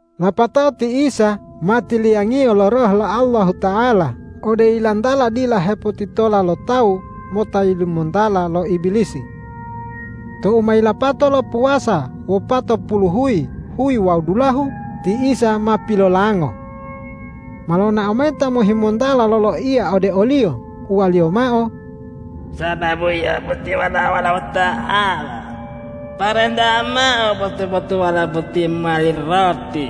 Lapatao ti Isa ma tiliyangiyo lo Roh lo Allahuta'ala ode yilantala dila hepotitola lo tawu mota yilimontala lo Ibilisi. Tou ma yilapato lo puwasa wopatopuluhuyi, huyi wawu dulahu, ti Isa ma pilolango. Ma lonao mayi ta mohimontala loloiya ode o-Liyo, uwaliyo mao,”Sababu Yio boti Walao Allahuta'ala, parentayi mao botu-botuwala boti mowali roti.”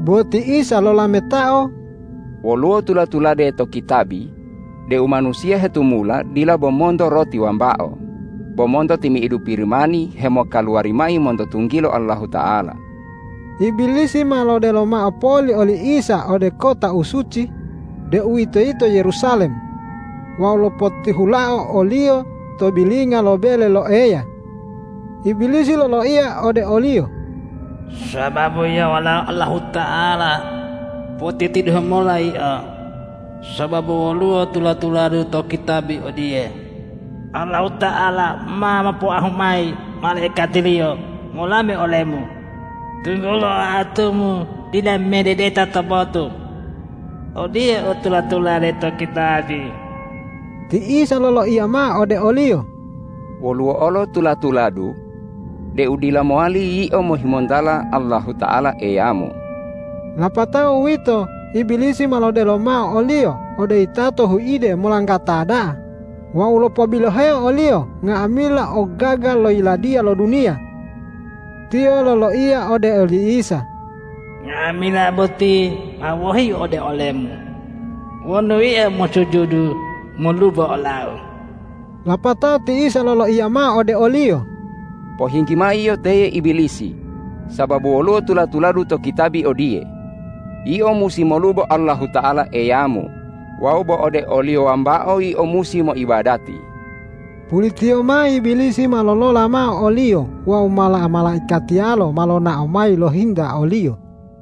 Bo ti Isa lolametao,”Woluwo tula-tulade to kitabi deu manusiya hetumula dila bo monto roti wambao, bo monto timi'idu Pirimani hemokaluwari mayi monto tunggilo Allahuta'ala.” Ibilisi ma lodelo mao poli oli Isa ode kota u suci, deuwitoyito Yerusalem, wawu lopotihulao o-Liyo to bilinga lo bele lo Eya. Ibilisi loloiya ode o-Liyo,”Sababu Yio Walao Allahuta'ala, potitidehu mola Yio; sababu woluwo tula-tuladu to kitabi odiye, ’Allahuta'ala ma mopoahu mayi malaikati-Liyo molame ole-Mu, tunggulo oatu-Mu dila mededeta to botu.’ Odiye u tula-tulade to kitabi.” Ti Isa loloiya mao ode oliyo,”Woluwo olo tula-tuladu deu dila mowali yio mohimontala Allahuta'ala Eyamu!” Lapato uwito Ibilisi ma lodelo mao o-Liyo ode yitato huide molanggata da'a wawu lopobiloheo o-Liyo nga'amila ogogaga lo yiladiya lo duniya. Tiyo loloiya ode oli Isa,”Nga'amila boti ma wohiu ode ole-Mu wonu Yio mosujudu molubo olau.” Lapatao ti Isa loloiya mao ode oliyo,”Pohinggi mao yio teye Ibilisi; sababu woluwo tula-tuladu to kitabi odiye, ’Yio musi molubo Allahuta'ala Eyamu wawu bo ode o-Liyo wambao yio musi moibadati!’” Pulitiyo mao Ibilisi ma lolola mao o-Liyo wawu mala-malaikatiyalo ma lonao mayi lohinta o-Liyo.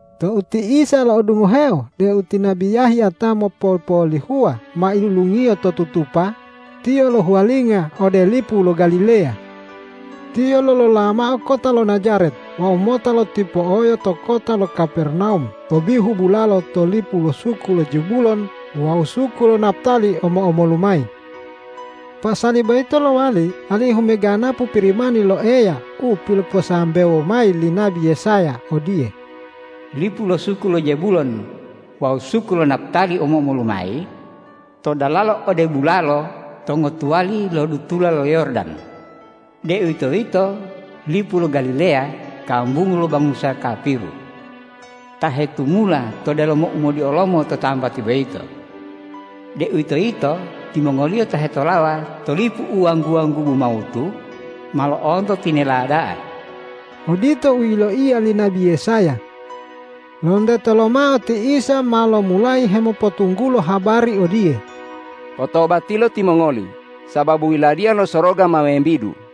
Tou ti Isa lo'odungoheo deu ti nabi Yahya ta mopopolihuwa ma ilulungiyo to tutupa, Tiyo lohuwalinga ode lipu lo Galileya. Tiyo lolola mao kota lo Najaret wawu mota lotipo'oyo to kota lo Kapernawum to bihu bulalo to lipu lo suku lo Zebulon wawu suku lo Naptali omo-omolu mayi. Pasali boyito lowali alihu meganapu Pirimani lo Eya u piloposambewo mayi li nabi Yesaya odiye, ”Lipu lo suku lo Zebulon wawu suku lo Naptali omo-omolu mayi, to dalala ode bulalo to ngotuwali lo dutula lo Yordan, deuwitoyito lipu lo Galileya kambungu lo bangusa kapiru, ta hetumula to delomo umodiolomo to tambati boyito, deuwitoyito timongoliyo ta hetolawa to lipu u wanggu-wanggubu mawutu, ma lo'onto tinela da'a.” Odito u yiloiya li nabi Yesaya. Lonteto lomao ti Isa ma lomulayi hemopotunggulo habari odiye,”Potobatilo timongoli sababu Yiladiya lo Soroga ma membidu!”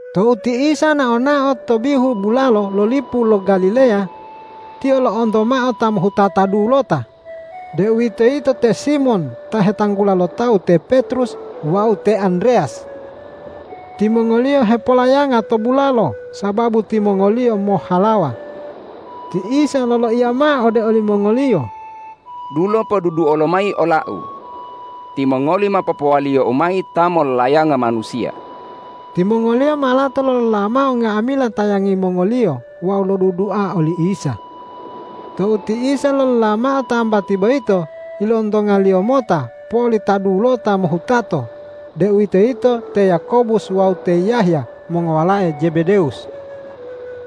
Tou ti Isa nao-nao to bihu bulalo lo lipu lo Galileya, Tiyo lo'onto mao ta mohutata dulota, deuwitoyito te Simon ta hetanggula lo tawu te Petrus wawu te Andreyas. Timongoliyo hepolayanga to bulalo sababu timongoliyo mohhalawa. Ti Isa loloiya mao ode olimongoliyo,”Dulo poduduo lomayi ola-U! Timongoli ma popowaliyo-U mayi ta mollayanga manusiya.” Timongoliyo ma lato lolola mao nga'amila tayangi mongoliyo wawu lodudua oli Isa. Tou ti Isa lolola mao tambati boyito, ilontonga-Liyo mota poli ta dulota mohutato, deuwitoyito te Yakobus wawu te Yahya mongowalae Jebedewus.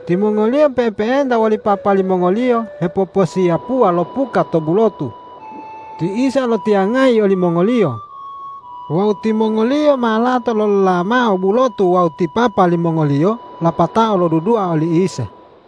Timongoliyo pe'epe'enta woli papa limongoliyo hepoposiyapuwa lo puka to bulotu. Ti Isa lotiyangayi olimongoliyo. Wawu timongoliyo ma lato lolola mao bulotu wawu ti papa limongoliyo lapatao lodudua oli Isa.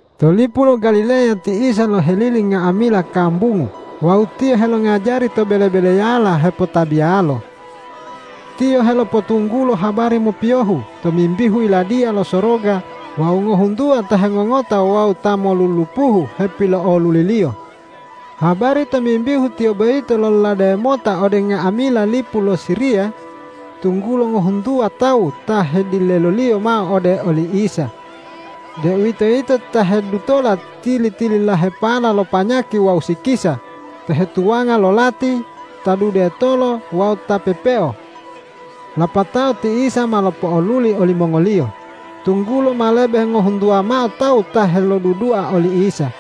To lipu lo Galileya ti Isa lohelili nga'amila kambungu wawu Tiyo helongajari to bele-beleyala hepotabiyalo. Tiyo helopotunggulo habari mopiyohu tomimbihu Yiladiya lo Soroga wawu ngohuntuwa ta hengongota wawu ta molulupuhu hepilo'oluli-Liyo. Habari tomimbihu Tiyo boyito lololade mota ode nga'amila lipu lo Siriya, tunggulo ngohuntuwa tawu ta hedileloliyo mao ode oli Isa, deuwitoyito ta hedutola tili-tililahepala lo panyaki wawu sikisa, ta hetuwanga lo lati, ta dudetolo wawu ta pepeo. Lapatao ti Isa ma lopo'oluli olimongoliyo, tunggulo ma lebe ngohuntuwa mao tawu ta helodudua oli Isa.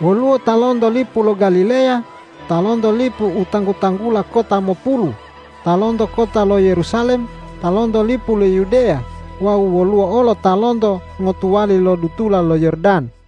Woluwo ta lonto lipu lo Galileya, ta lonto lipu u tanggu-tanggula Kota Mopulu, ta lonto kota lo Yerusalem, ta lonto lipu lo Yudeya wawu woluwo olo ta lonto ngotuwali lo dutula lo Yordan.